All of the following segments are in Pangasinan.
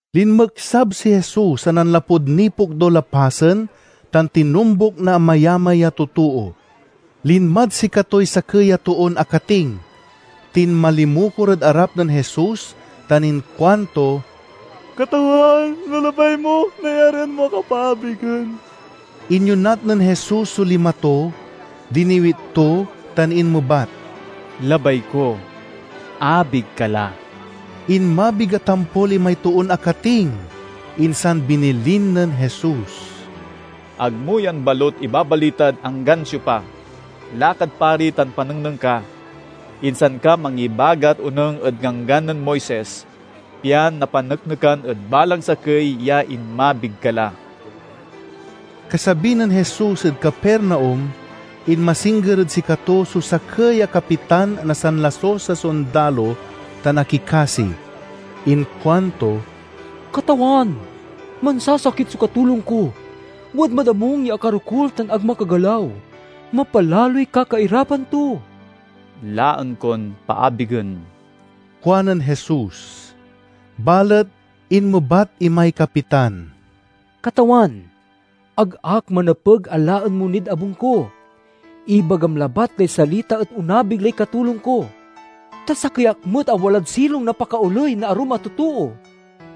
Linmeksab si Jesus a nanlapud nipokdul a pasen tan tinombuk na amayamay a totoo. Linmad sikatoy sakey a toon akating, tinmalimukor ed arap nen Jesus tan inkuanto, "Katawan, no labay mo, nayarian mo ak a paabigen." Inyonat nen Jesus so lima to, diniwit to tan inmebat, "Labay ko. Abig ka la!" Inmabig a tampol imay toon akating. Insan binilin nen Jesus, "Ag mo yan balut ibabalitad anggan siopa. Lakad pari tan panengneng ka, insan ka mangibagat onung ed Ganggan nen Moises, pian napaneknekan ed balang sakey ya inmabig ka la." Kasabi nen Jesus ed Capernaum, inmasingger ed sikato so sakey a kapitan na sanlasus a sondalo tan akikasi. Inkuanto, "Katawan, mansasakit so katulong ko. Wadmad abung ya akarokul tan ag makagalaw. Mapalaloy kakairapan to." "Laen kon paabigen," kuanen Jesus. Balet inmebat imay kapitan, "Katawan, ag ak manepeg a laen mo nid abung ko. Ibagam labat lay salita et onabig lay katulong ko. Ta sakey ak met a walad silong na pakaoley na arum a totoo,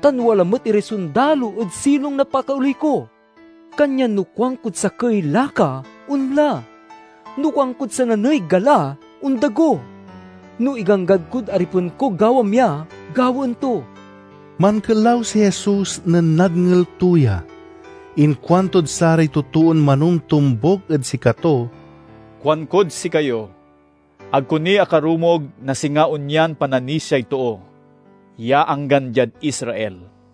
tan wala met iray sondalo ed silong na pakaoley ko. Kanyan no kuankod sakey, 'Laka!' onla; no kuankod sananey, 'Gala!' ondago. No iganggan kod aripen ko 'Gawam ya!' gawaen to." Mankelaw si Jesus nen nadngel to ya. Inkuantod saray totoon manomtombuk ed sikato, "Kuankod sikayo: ag ko ni akarumog na singa onyan pananisiay too, ya anggan diad Israel.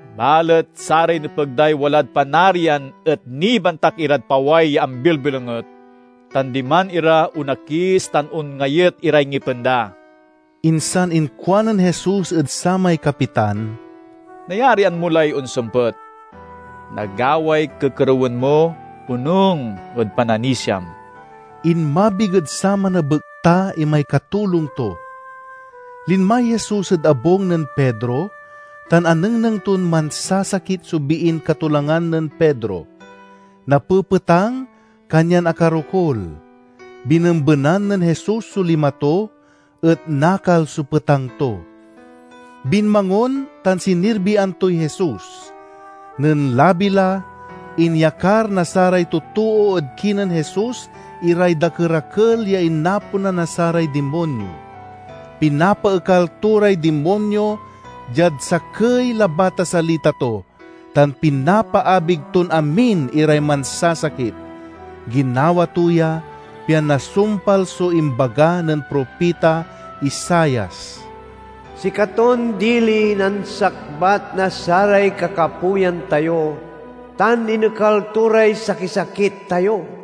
Balet saray nepeg day walad Panarian et nibantak irad paway ya ambilbilonget, tan diman ira onakis tan onngayet iray ngipen da." Insan inkuanen Jesus ed samay kapitan, "Nayarian mo lay onsempet. Nagaway kekerewen mo, onung ed pananisiam." Inmabig ed saman a bekta imay katulong to. Linmay Jesus ed abung nen Pedro, tan anengneng ton mansasakit so biin katolangan nen Pedro. Napepetang, kanyan akarokul. Binembenan nen Jesus so lima to, et nakal so petang to. Binmangon tan sinirbian toy Jesus. Nen labi la, inyakar na saray totoo ed kinen Jesus iray dakerakel ya inaponan na saray dimonyo. Pinapaekal to ray dimonyo diad sakey labat a salita to, tan pinapaabig ton amin iray mansasakit. Ginawa to ya, pian nasumpal so imbaga nen propita Isaias, "Sikaton diliy nansakbat na saray kakapoyan tayo, tan inekal to ray sakisakit tayo."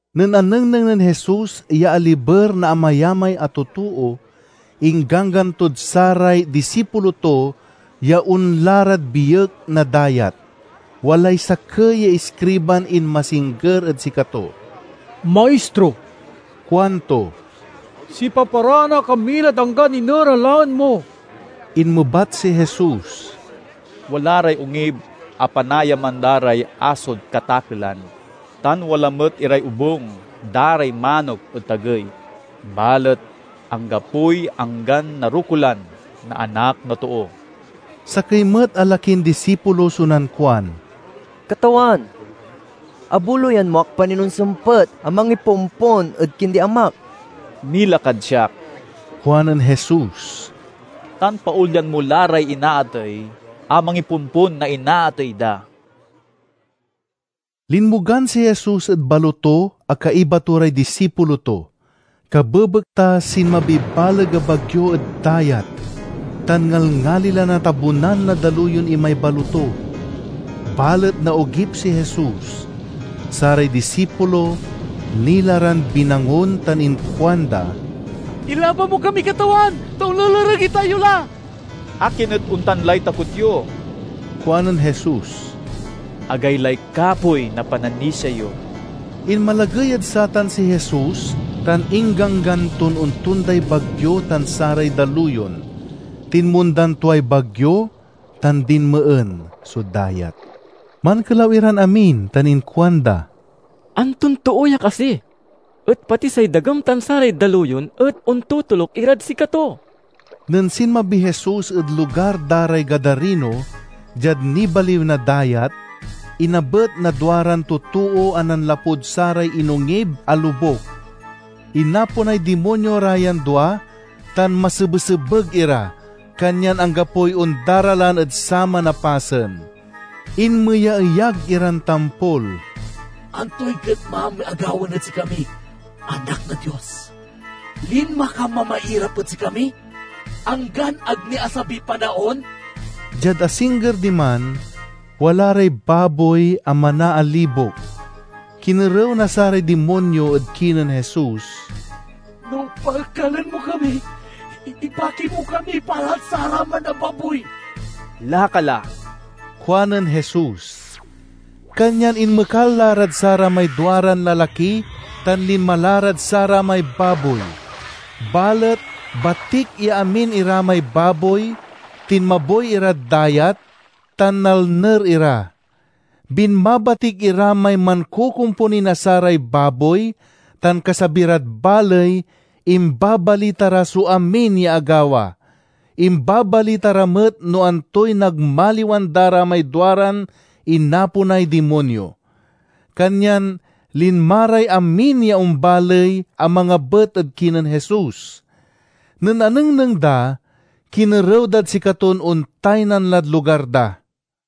Nen anengneng nen Jesus ya aliber na amayamay a totoo, ingganggan tod saray disipulo to ya onla rad biek na dayat. Walay sakey ya iskriban inmasingger ed sikato. "Maistro," kuanto, "sipaparaan ak a milad anggan iner a laen mo." Inmebat si Jesus, "Wala ray ongib a panaayaman da ray asod katakelan, tan wala met iray obung da ray manok ed tagey, balet anggapoy anggan narokulan na Anak na Too." Sakey met a lakin disipulo so nankuan, "Katawan, abuloyan mo ak pa nin onsempet a mangipompon ed kindi amak." "Mila kad siak," kuanen Jesus, "tan paolyan mo la ray inaatey a mangipompon na inaatey da." Linmogan si Jesus ed baloto a kaiba to ray disipulo to. Kabebekta sinmabiy baleg a bagyo ed dayat, tan ngalngali la natabunan na daluyon imay baloto. Balet naogip si Jesus. Saray disipulo nila ran binangon tan inkuanda, "Ilaban mo kami, Katawan, ta onlelereg itayo la!" "Akin et ontan lay takot yo?" kuanen Jesus. "Agaylay kapoy na pananisia yo!" Inmalagey ed satan si Jesus, tan ingganggan ton ontonday bagyo tan saray daluyon. Tinmondan tuay bagyo tan dinmeen so dayat. Mankelaw iran amin tan inkuanda, "Anton too ya kasi, et pati say dagem tan saray daluyon et ontotoluk irad sikato?" Nen sinmabiy Jesus ed lugar da ray Gadarino, diad nibaliw na dayat, inabet na duaran totoo a nanlapud saray inongib a lobuk. Inaponay dimonyo ra yan dua tan masebesebeg ira, kanyan anggapoy ondaralan ed saman a pasen. Inmeyaeyag iran tampol, "Antoy getmam a gawaen ed sikami, Anak na Dios? Linma ka mamairap ed sikami, anggan ag ni asabiy panaon?" Diad asingger diman, wala ray baboy a manaalibok. Kinerew na saray dimonyo ed kinen Jesus, "No paekalen mo kami, ibaki mo kami pa lad saraman a baboy." "Laka la," kuanen Jesus. Kanyan inmekal la rad saramay duaran lalaki tan linma rad saramay baboy. Balet batik ya amin ira may baboy tinmaboy irad dayat, tan nalner ira. Binmabatik ira may mankokomponi na saray baboy, tan kasabi rad baley, imbabalita ra so amin ya agawa. Imbabalita ra met no antoy nagmaliwan da ra may duaran inaponay dimonyo. Kanyan linma ray amin ya ombaley a mangabet ed kinen Jesus. Nen anengneng da, kinerew dad sikaton ontaynan lad lugar da.